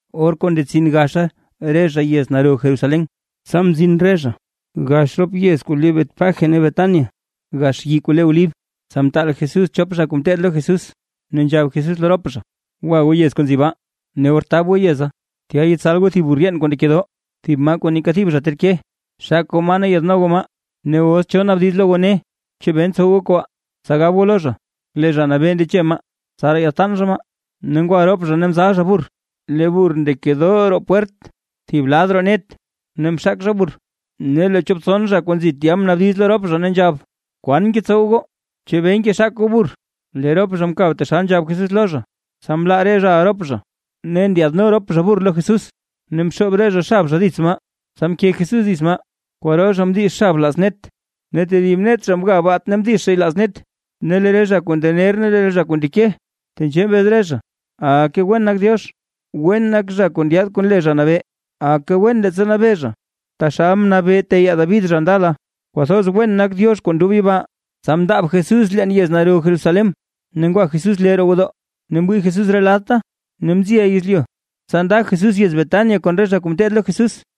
Or kuu ndetsin gaxa re zha yez naro Jerusalén, tsa mzin re zha gax rop yez kuu le Betfagé ne Betania, gax yii kuu le Olib, tsa mtaal Jesús chop zha kuu ngeteed lo Jesús, ne nzhab Jesús lo rop zha: ―Gwa goo yez kuu nzi baa. Ne or tab goo yeza, tya yetsal goo thib burr yeen kuu ndekedoo, thib maa kuu neeka thib zha ter ke. Xak goo maa ne yaadno goo maa. Ne os cho naabdiz lo goo ne: “¿Chebee ntsow goo kobaa?” Tsa gab goo lo zha: “Lee Zha Nabee ndeche maa, tsaraa yaadtaan zha maa”. Ne ngwa rop zha ne mzal zha burr, lee burr ndekedoo roo pwert thib lad roo net ne mxak zha burr. Ne lee chop tson zha kuu nzi tya mnaabdiz lo rop zha ne nzhab: ―¿Kwan ngetsow goo? ¿Chebee ngexak goo burr? Lee rop zha mkab taxal nzhab Jesús lo zha, tsa mlaa re zhaʼa rop zha. Ne ndyaadno rop zha burr lo Jesús, ne mxoob re zha xab zha dits maa, tsa mke Jesús dits maa. Kwaro zha mdix xab laaz net, ne tedib net zha mga baat ne mdix zhay laaz net. Ne lee re zha kuu ndener ne re zha kuu ndeke, tenzhee mbez re zha: ―¡Aka wen nak Diox! ¡Wen nak zha kuu ndyaad kon le Zha Nabee! ¡Aka wen leettsa nabee zha taxal mnabee teyaa David zha ndala! ¡Kwathoz wen nak Diox kuu ndob yibaa! Tsa mndaab Jesús leen yez naro Jerusalén, ne ngwa Jesús lee roo gwodoo ne mwii Jesús re ladta, ne mziʼa yezlyu, tsa nda Jesús yez Betania kon re zha kuu ngeteed lo Jesús.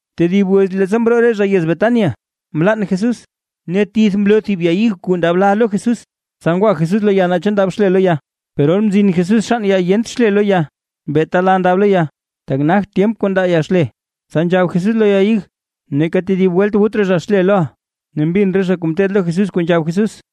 Tedib wiz leettsa mroo re zha yez Betania, mlann Jesús. Ne tith mloo thib ya ig kuu ndab la lo Jesús, tsa ngwa Jesús lo ya naa chu ndab xle lo ya. Per or mzin Jesús xann ya yent xle lo ya, beeta la ndab lo ya, tak nagt tyemp kuu ndaa ya xle. Tsa nzhab Jesús lo ya ig: ―Neeka tedib welt wut raa zha xle loʼa. Ne mbin re zha kuu ngeteed lo Jesús, kuu nzhab Jesús.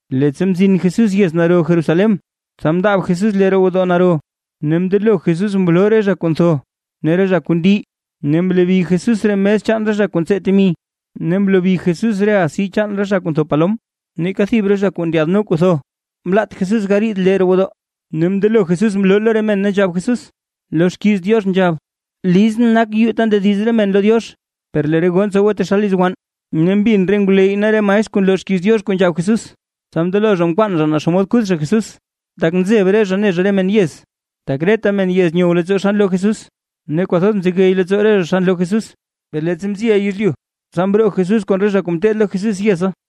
Leettsa mzin Jesús yez naro Jerusalén, tsa mndaab Jesús lee roo gwodoo naro, ne mndelo Jesús mloo re zha kuu ntho, ne re zha kuu ndi. Ne mlobi Jesús re mes chaan re zha kuu ntsiil temi, ne mlobi Jesús re asi chaan re zha kuu ntho palom. Neeka thib re zha kuu ndyaadno kuu ntho, mlaat Jesús gariid lee roo gwodoo. Ne mndelo Jesús mloo Jesús lo re men ne nzhab Jesús: ―Lo xkiiz Diox nzhab: “Lee lizʼn nak yuu ta ndediz re men lo Diox”, per lee re goo ntsowe taxal liz wann. Ne mbin re ngwleyy ne re maestr kuu nloo xkiiz Diox re kuu nzhab Jesús, tsa mndelo zha nkwaan zha naa xomod kuth zha Jesús, tak nzeb re zha ne zha re men yez, tak reta men yez nyow leettsoo xa nloo Jesús, ne kwathoz mzegey leettsoo re zha xa nloo Jesús. Per leettsa mziʼa yezlyu, tsa mroo Jesús kon re zha kuu ngeteed lo Jesús yeza.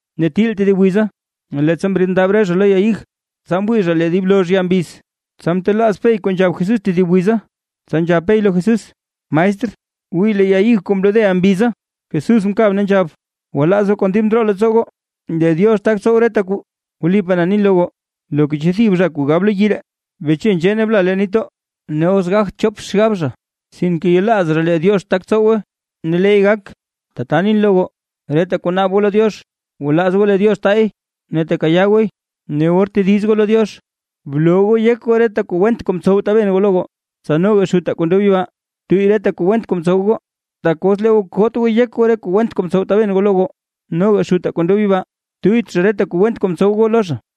Ne til tedib wiza, leettsa mriid re zha lo ya ig, tsa mwii zha lee dib lozh ya mbiz. Tsa mtelaaz Pey kuu nzhab Jesús tedib wiza, tsa nzhab Pey lo Jesús: ―Maestr, wii lee ya ig kuu mlodeʼa mbiza. Jesús mkab ne nzhab: ―Gwalaaz goo kon dib ndroo leettsoo goo, lee Diox tak tsow reta kwaa. Wlipaa na nin lo goo, loka cho thib zha kuu gab lo yii ree: “Beche nzhee ne bla leen nitdoo”, ne os gagt chop xgab zha, sinke yelaaz zha lee Diox tak tsowe ne leey gak. Tata nin lo goo, reta kuu naab goo lo Diox, gwalaaz goo lee Diox taay ne tekayaa gooy. Ne or tediz goo lo Diox, bloo goo yek goo reta kuu went kuu mtsow taben goo lo goo, tsa noga Xutaa kuu ndob yibaa, tuyy reta kuu went kuu mtsow goo. Tak os lee goo koot goo yek goo, re kuu went kuu mtsow taben goo lo goo, noga Xutaa kuu ndob yibaa tuyyt zha reta kuu went kuu ntsow goo lo zha.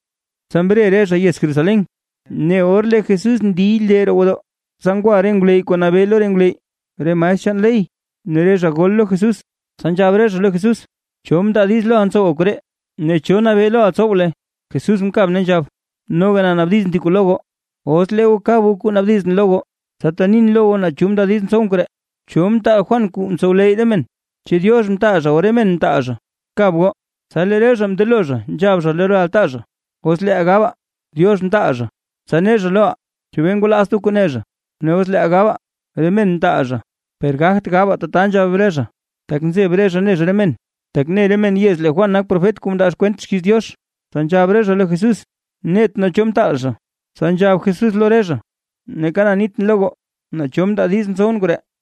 Tsa mre re zha yez Jerusalén, ne or lee Jesús ndiy lee roo gwodoo, tsa ngwa re ngwleyy kuu nabee lo re ngwleyy, re maestr chaan ley ne re zha gol lo Jesús. Tsa nzhab re zha lo Jesús: ―¿Cho mndaa diiz loʼa ntsowa koree? Ne ¿cho nabee loʼa tsow luy? Jesús mkab ne nzhab: ―Noga na naabdizʼn thib kuu lo goo. Os lee goo kab goo kuu naabdizʼn lo goo, tsasi tenin lo goo naa cho mndaa diiz ntsowʼn koree. ¿Cho mtaal Juan kuu mtsowleyy re men? ¿Chu Diox mtaal zha o re men mtaal zha? ¡Kab goo! Tsa lee re zha mndelo zha nzhab zha lo re altaa zha: ―Os leeʼaa gabaa: “Diox mtaal zha”, tsa ne zha loʼaa: “¿Chebee ngwalaazt goo kuu ne zha?” Ne os leeʼaa gabaa: “Re men mtaal zha…”, per gagt gabaa tata ―nzhab re zha. Tak nzeb re zha ne zha re men, tak ne re men yez lee Juan nak profet kuu mndaa kwent xkiiz Diox. Tsa nzhab re zha lo Jesús: ―Net nee cho mtaal zha. Tsa nzhab Jesús lo re zha: ―Neeka na nitʼn lo goo, naa cho mndaa diiz ntsowʼn koree.